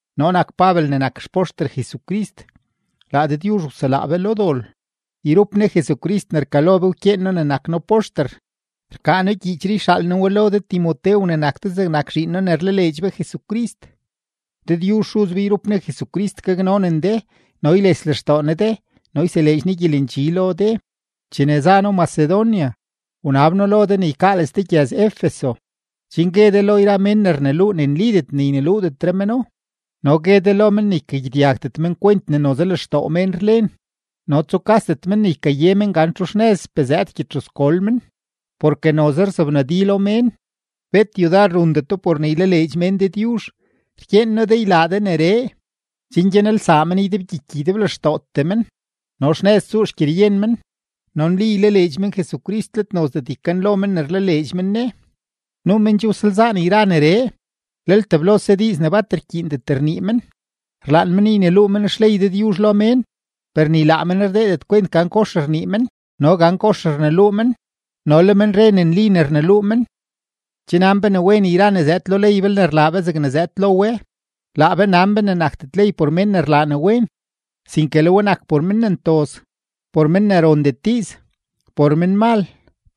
Noo nak Pabel ne nak xpoxter Jesucrist. Laa Dëdyuzh wselaa be lo dol; yrup Ne Jesucrist ne rkalo be wkyeen noo ne nak noo poxter. Rkaa noo gyiichree yxaal noo we lo de Timotew ne nak de zegnak zhiin noo ne rlaleedx be Jesucrist. Dëdyuzh Xuz be yrup Ne Jesucrist gaknonen de no yles lextoo Ne de no yseleedx Ne gyelendxi lo de. Chene za noo Macedonia, wnab noo lo de ne ykaales de gyëz-Efeso, chen gue de lo yra mén ne rneluu ne nlidet ne yneluudetre meno no gue de lo men ne ykagyedyagdet men kwent ne noze lextoo mén rlen no tsukasdet men ne ykaye men gan txu xnëzpee zëëd gyedxuzgol men. Porke noze rzobnadilo mén, bet yudar rundeto por ne ylaleedx mén Dëdyuzh. Rkyeen noo de ylaa de neree, chen gyanelsaa men ydebgyiky ydeblextootee men, no xnëz tsuu xgyeryen men, no nli ylaleedx men Jesucrist, let nozdet ykanlo men ne rlaleedx men Ne. Nuu men che wsalzaan yra neree, lel teblose diiz ne bat rkyiindet rnii men. Rlaan men yneluu men xley Dëdyuzh lo mén, per ni laa men rdeedet kwent gan kox rnii men no gan kox rneluu men no le men re ne nli ne rneluu men. Che nan be ne wen yra ne zëëd lo ley belne rlaa be zegne zëëd lo we. Laa be nan be ne nakdet ley por mén ne rlaa ne wen, sinke le we nak por men ne ntoz, por men ne rondet diiz, por menmal,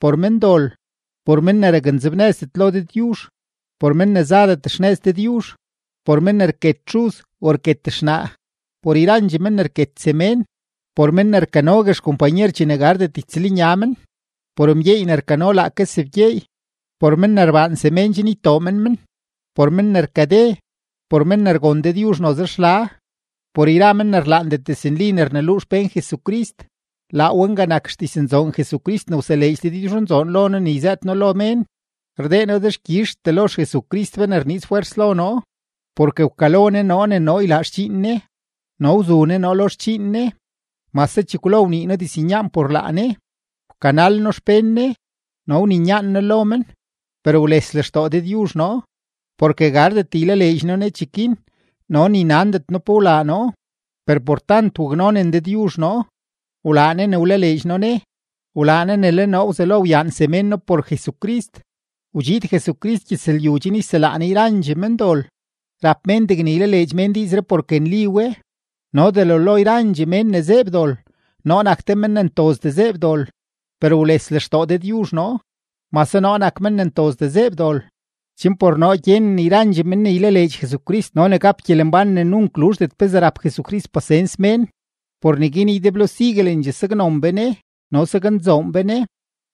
por mendol, por men ne raknzebnëzdet lo Dëdyuzh, por men ne zadet xnëz Dëdyuzh, por men ne rket xuz o rket xnaa, por yrandxee men ne rket semén, por men ne rkanogue xkompanyer chene gardet ytsëlnya men, por mgyeey ne rkano laake sebgyeey, por men ne rbaan semén chen ytoo men men, por men ne rkade, por men ne rgon Dëdyuzh noze xla, por yra men ne rlaandet diznli ne rneluu xpén Jesucrist. Laa we nga nak xdiznzoon Jesucrist ne wseleedx Dëdyuzhnzoon lo noo ne yzëët noo lo mén. Rdee noo dexkyizhtee lo XJesucrist be ne rniiz fwers lo noo, porke wkalo Ne noo ne noo ylaa xdxiin Ne no wzu Ne noo lo xdxiin Ne, mase chekwlo wnii noo diznyaan por laa Ne, wkanal noo xpén Ne no wninyaan noo lo men. Per wles lextoo Dëdyuzh noo, porke gardet ylaleedx noo Ne cheguin no ni nandet noo pe wlaa noo. Per por tant waknonen Dëdyuzh noo, wlaa Ne ne wlaleedx noo Ne, wlaa Ne ne le noo wzelo wyaan semén noo por Jesucrist. Wdxiid Jesucrist gyëzlyu chen yselaa Ne yrandxee mendol. Rap mén degne ylaleedx mén diizree porke nli we; no delo lo yrandxee mén ne zeeb dol, noo nak te men ne ntozdee zeeb dol. Per wles lextoo Dëdyuzh noo, mase noo nak men ne ntozdee zeeb dol, chen por noo gyenen yrandxee men ne ylaleedx Jesucrist no ne gap gyelembán ne nunk luzhdet pezee rap Jesucrist pasens mén. Por neguin ydeblo siguelendxee saknon be Ne no saknzoon be Ne;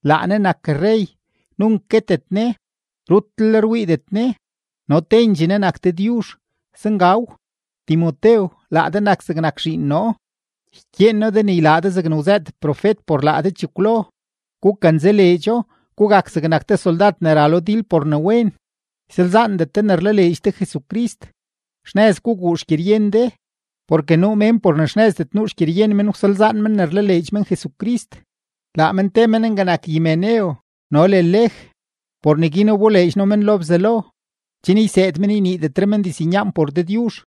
laa Ne nak rrey, nunk guetet Ne, rutlel rwiidet Ne, no tendxee Ne nak Dëdyuzh. Zengaw. Timotew, laa de nak zegnak zhiin noo, ykyeen noo de ne ylaa de zegne wzëët profet por laa de chekwlo; gukanzaleedxo, gugak zegnak te soldad ne ra lo dil por ne wen. Ysalzaandet de ne rlaleedx de Jesucrist; xnëz guguu xgyeryen de. Porke nuu mén por ne xnëzdet nuu xgyeryen men wsalzaan men ne rlaleedx men Jesucrist. Laa men te men nga nak Himeneo no le Lej. Por neguin wboleedx noo men lo Bzelo, chen yseed men yniidetre men diznyaan por Dëdyuzh.